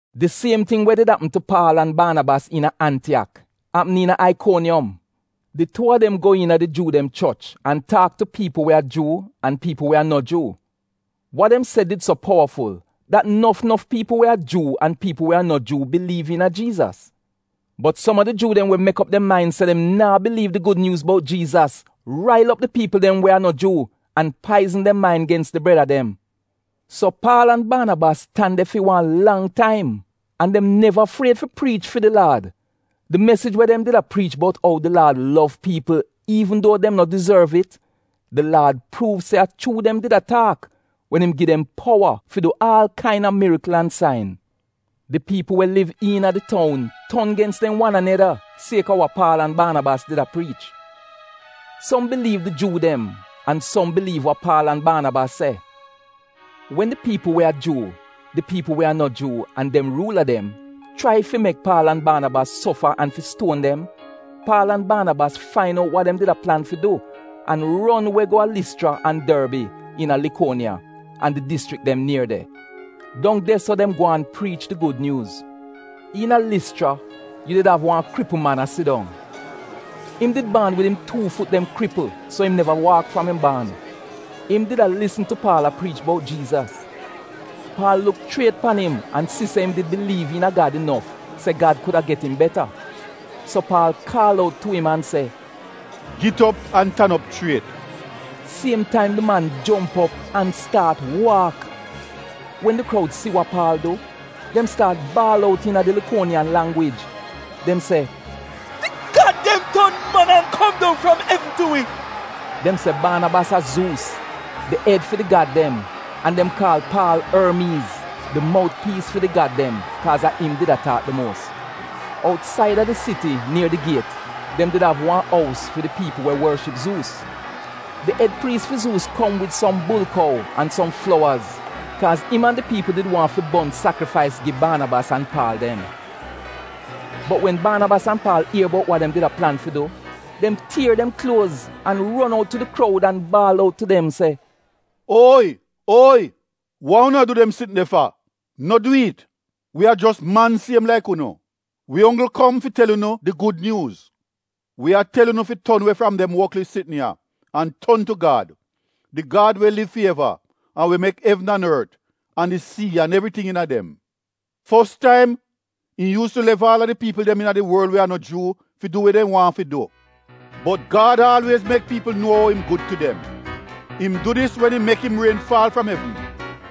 Di siem ting we did apm tu Paal an Baanabas iina Antiyak apm iina Aikoniyom. Di tuu a dem go iina di Juu dem choch an taak tu piipl we a Juu an piipl we a no Juu. Wa dem se did so powaful dat nof nof piipl we a Juu an piipl we a no Juu biliiv iina Jiizas. Bot som a di Juu dem we mek op dem main se dem naa biliiv di gud nyuuz bout Jiizas, rail op di piipl dem we a no Juu, an paizn dem main gens di breda dem. So Paal an Baanabas tan de fi wan lang taim. An dem neva fried fi priich fi di Laad. Di mesij we dem did a priich bout ou di Laad lov piipl iivn duo dem no dizorv it, di Laad pruuv se a chuu dem did a taak wen im gi dem powa fi du aal kaina mirikl an sain. Di piipl we liv iina di toun ton gens dem wan aneda sieka wa Paal an Baanabas did a priich. Som biliiv di Juu dem an som biliiv wa Paal an Baanabas se. Wen di piipl we a Juu, di piipl we a no Juu an dem ruula dem chrai fi mek Paal an Baanabas sofa an fi stuon dem, Paal an Baanabas fain out wa dem did a plan fi du an ron we go a Lischra an Dorbi iina Likuoniya an di dischrik dem nier de. Dong de so dem gwaan priich di gud nyuuz. Iina Lischra yu did av wan kripl man a sidong. Im did baan wid im tuu fut dem kripl so im neva waak fram im baan. Im did a lisn tu Paal a priich bout Jiizas. Paal luk chriet pan im an si se im did biliiv iina Gad inof se Gad kuda get im beta. So Paal kaal out tu im an se, “Git op an tan op chriet!” Siem taim di man jomp op an staat waak. Wen di kroud si wa Paal du, dem staat baal out iina di Laikoniyan langwij, dem se, “Di gad dem ton man an kom dong fram evn tu wi.” Dem se Baanabas a Zuus, di ed fi di gad dem, an dem kaal Paal Ormiiz, di mout piis fi di gad dem, kaaz a im did a taak di muos. Outsaida di siti nier di giet, dem did av wan ous fi di piipl we worship Zuus. Di ed priis fi Zuus kom wid som bulkou an som flowaz kaaz im an di piipl did waahn fi bon sakrifais gi Baanabas an Paal dem. Bot wen Baanabas an Paal ier bout wa dem did plan fi du, dem tier dem kluoz, an ron out tu di kroud an baal out tu dem se: “Oyi! Oyi! Wa unu a du dem sitn de fa? No dwi'it! Wi a jos man siem laik unu! Wi onggl kom fi tel unu di Gud Nyuuz. Wi a tel unu fi ton we fram dem woklis sitn ya, an ton tu Gad, di Gad we liv fi eva an we mek evn an ort an di sii an evriting iina dem. Fos taim im yuus tu lef aal a di piipl iina di worl we a no Juu fi du we dem waahn fi du. Bot Gad aalwiez mek piipl nuo ou im gud tu dem. Im du dis wen im mek im rien faal fram evn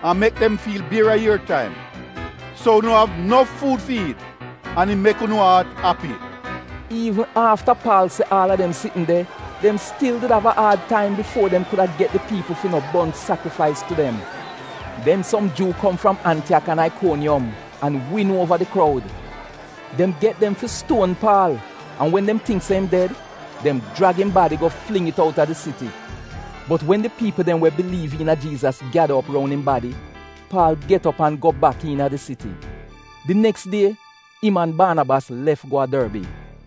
an mek dem fiil bier a ier taim, so unu av nof fuud fi iit an im mek unu aat api.” Iivn afta Paal se aal a dem sitn de, dem stil did av a aad taim bifuo dem kuda get di piipl fi no bon sakrifais tu dem. Den som Juu kom fram Antiyak an Aikoniyom an win uova di kroud. Dem get dem fi stuon Paal an wen dem tingk se im ded, dem jrag im badi go fling it outa di siti. Bot wen di piipl dem we biliiv iina Jiizas gyada op roun im badi, Paal get op an go bak iina di siti. Di neks die im an Baanabas lef go a Dorbi.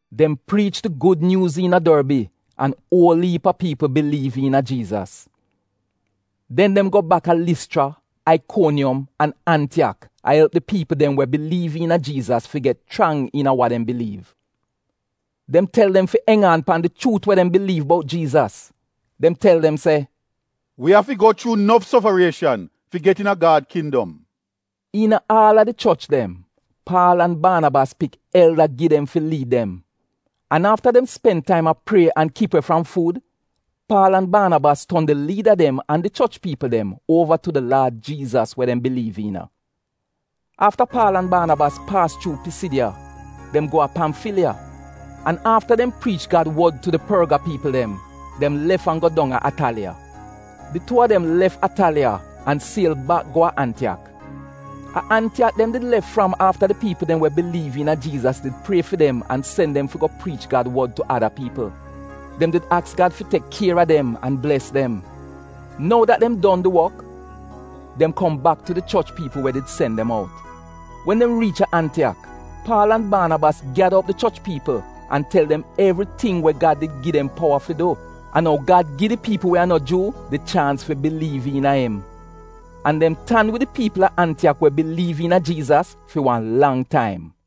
Dem priich di gud nyuuz iina Dorbi an uol iip a piipl biliiv iina Jiizas. Den dem go bak a Lischra, Aikoniyom, an Antiyak a elp di piipl dem we biliiv iina Jiizas fi get chrang iina wa dem biliiv. Dem tel dem fi enj aan pan di chuut we dem biliiv bout Jiizas. Dem tel dem se, “Wi afi go chuu nof sofarieshan fi get iina Gad kindom. Iina aal a di choch dem, Paal an Baanabas pik elda gi dem fi liid dem. An afta dem spen taim a prie an kip we fram fuud, Paal an Baanabas ton di liida dem an di choch piipl dem uova tu di Laad Jiizas we dem biliiv iina. Afta Paal an Baanabas paas chuu Pisidiya, dem go a Pamfiliya, an afta dem priich Gad wod tu di Porga piipl dem, dem lef an go dong a Ataliya. Di tuu a dem lef Ataliya an siel bak go a Antiyak. A Antiyak dem did lef fram afta di piipl dem we biliiv iina Jiizas did prie fi dem an sen dem fi go priich Gad wod tu ada piipl. Dem did aks Gad fi tek kier a dem an bles dem. Nou dat dem don dem di wok, dem kom bak tu di choch piipl we did sen dem out. Wen dem riich a Antiyak, Paal an Baanabas gyada op di choch piipl an tel dem evriting we Gad did gi dem powa fi du, an ou Gad gi di piipl we a no Juu di chaans fi biliiv iina im. An dem tan wid di piipl a Antiyak we biliiv iina Jiizas fi wan lang taim.